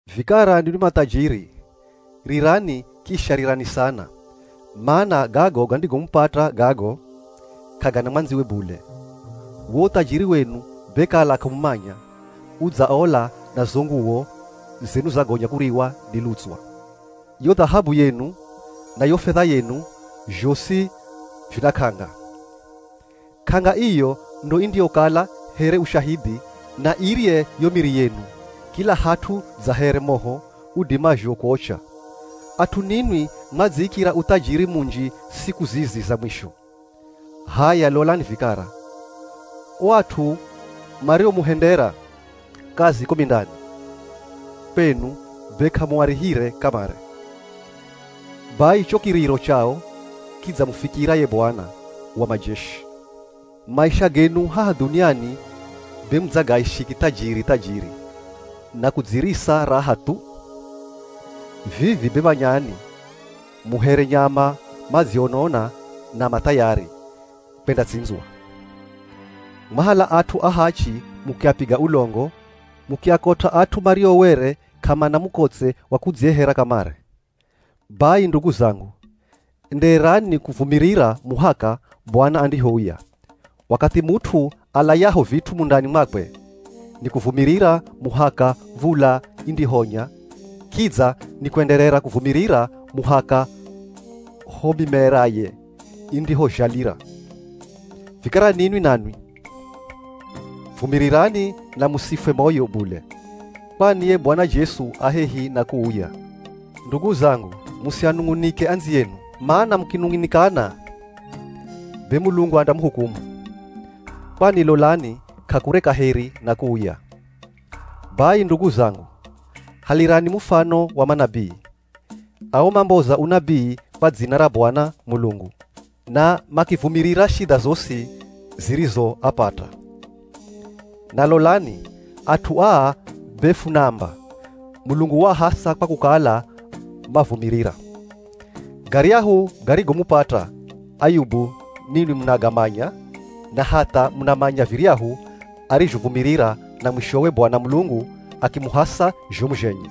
Vikara ninwi mathajiri, rirani kisha rirani sana, mana gago gandigomupata gago, k'agana mwandziwe bule. Wo uthajiri wenu be kala k'amumanya, udzaola na zo nguwo zenu zagonya kuriwa ni lutswa. Yo dhahabu yenu, na yo fedha yenu, zhosi vina k'anga. K'anga iyo ndo indiyokala here ushahidhi na irye yo miri yenu kila hat'u dza here moho udimazho kuocha. At'u ninwi mwadziikira uthajiri munji siku zizi za mwisho. H'aya lolani vikara, o at'u mariomuhendera kazi ko mindani kwenu be k'amuarihire kamare. Bai cho kiriro chao kidzamufikira ye Bwana wa majeshi. Maisha genu haha dhuniani be mudzagaishi kithajiri thajiri na kudzirisa raha thu. Vivi be manyani mu here nyama madzionona na ma thayari kwendatsindzwa. Mwahala at'u ahachi mukiapiga ulongo mukiakot'a, at'u mario were k'amana mukotse wa kudzihehera kamare. Bai ndugu zangu, endererani kuvumirira muhaka Bwana andihouya. Wakathi mut'u alayaho vit'u mundani mwakwe, nikuvumirira muhaka v̱ula indihonya. Kidza nikuenderera kuvumirira muhaka ho mimeraye indihozhalira. Vikara ninwi nanwi, vumirirani na musifwe moyo bule, kwani ye Bwana Jesu a hehi na kuuya. Ndugu zangu, musianung'unike andziyenu, mana mukinung'unikana be Mulungu andamuhukumu, kwani lolani k'akure kaheri na kuuya. Bai ndugu zangu, halirani mufano wa manabii. Ao mamboza unabii kwa dzina ra Bwana Mulungu na makivumirira shidha zosi zirizoapata. Na lolani, at'u aa be funaamba, Mulungu waahasa kwa kukala mavumirira. Garyahu garigomupata Ayubu ninwi munagamanya na hatha munamanya viryahu arizhovumirira na mwishowe Bwana Mulungu akimuhasa zhomu zhenye.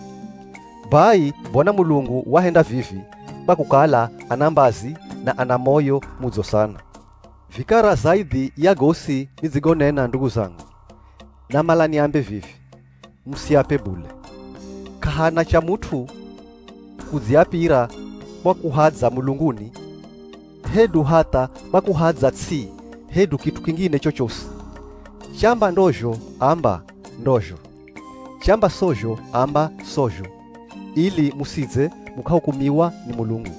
Bai Bwana Mulungu wahenda vivi kwa kukala ana mbazi na ana moyo mudzo sana. Vikara zaidhi ya gosi nidzigonena ndugu zangu, namala niambe vivi, musiape bule. K'ahana cha mut'u kudziapira kwa kuhadza mulunguni hedu hatha kwa kuhadza ts'i hedu kit'u kingine chochosi. Chamba ndozho amba, “Ndozho,” chamba sozho amba, “Sozho,” ili musidze mukahukumiwa ni Mulungu.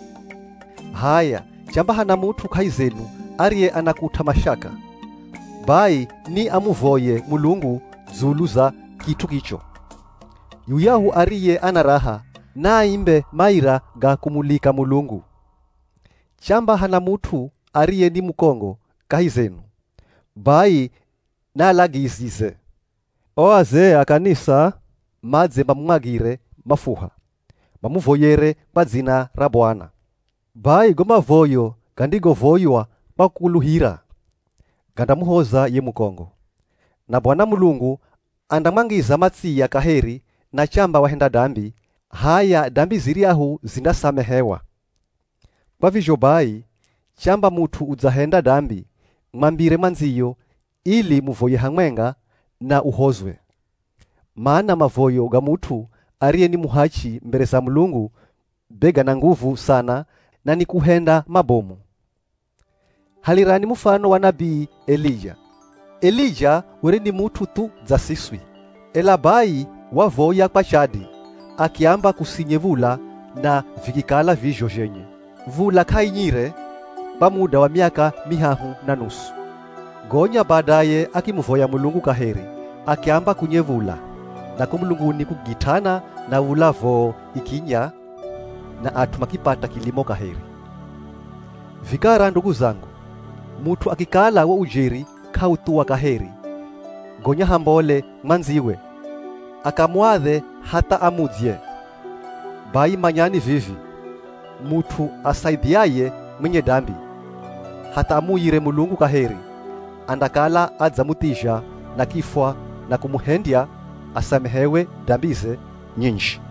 H'aya, chamba hana mut'u kahi zenu ariye anakut'a mashaka, bai ni amuvoye Mulungu dzulu za kit'u kicho. Yuyahu ariye ana raha, naaimbe maira ga kumulika Mulungu. Chamba hana mut'u ariye ni mukongo kahi zenu, bai naalagizize o azee a kanisa madze mamumwagire mafuha, mamuvoyere kwa dzina ra Bwana. Bai go mavoyo gandigovoywa kwa kukukuluhira, gandamuhoza ye mukongo. Na Bwana Mulungu andamwangiza matsiya kaheri na chamba wahenda dambi, h'aya dambi ziryahu zindasamehewa. Kwa vizho bai, chamba mut'u udzahenda dambi mwambire mwandziyo ili muvoye hamwenga na uhozwe. Mana mavoyo ga mut'u ariye ni muhachi mbere za Mulungu be gana nguvu sana na nikuhenda mabomu. Halirani mufano wa nabii Elija. Elija were ni mut'u thu dza siswi, ela bai wavoya kwa chadi akiamba kusinye v̱ula na vikikala vizho zhenye. V̱ula k'ainyire kwa muda wa miaka mihahu na nusu. Gonya badaye akimuvoya Mulungu kaheri, akiamba kunye v̱ula, na ko mulunguni kukigit'ana, na v̱ula voo ikinya na at'u makipata kilimo kaheri. Vikara ndugu zangu, mut'u akikala wo ujeri k'authuwa kaheri, gonya hambole mwandziwe akamuadhe hatha amudzye, bai manyani vivi, mut'u asaidhiaye mwenye dambi hatha amuuyire Mulungu kaheri, andakala adzamuthizha na kifwa na kumuhendya asamehewe dambize nyinji.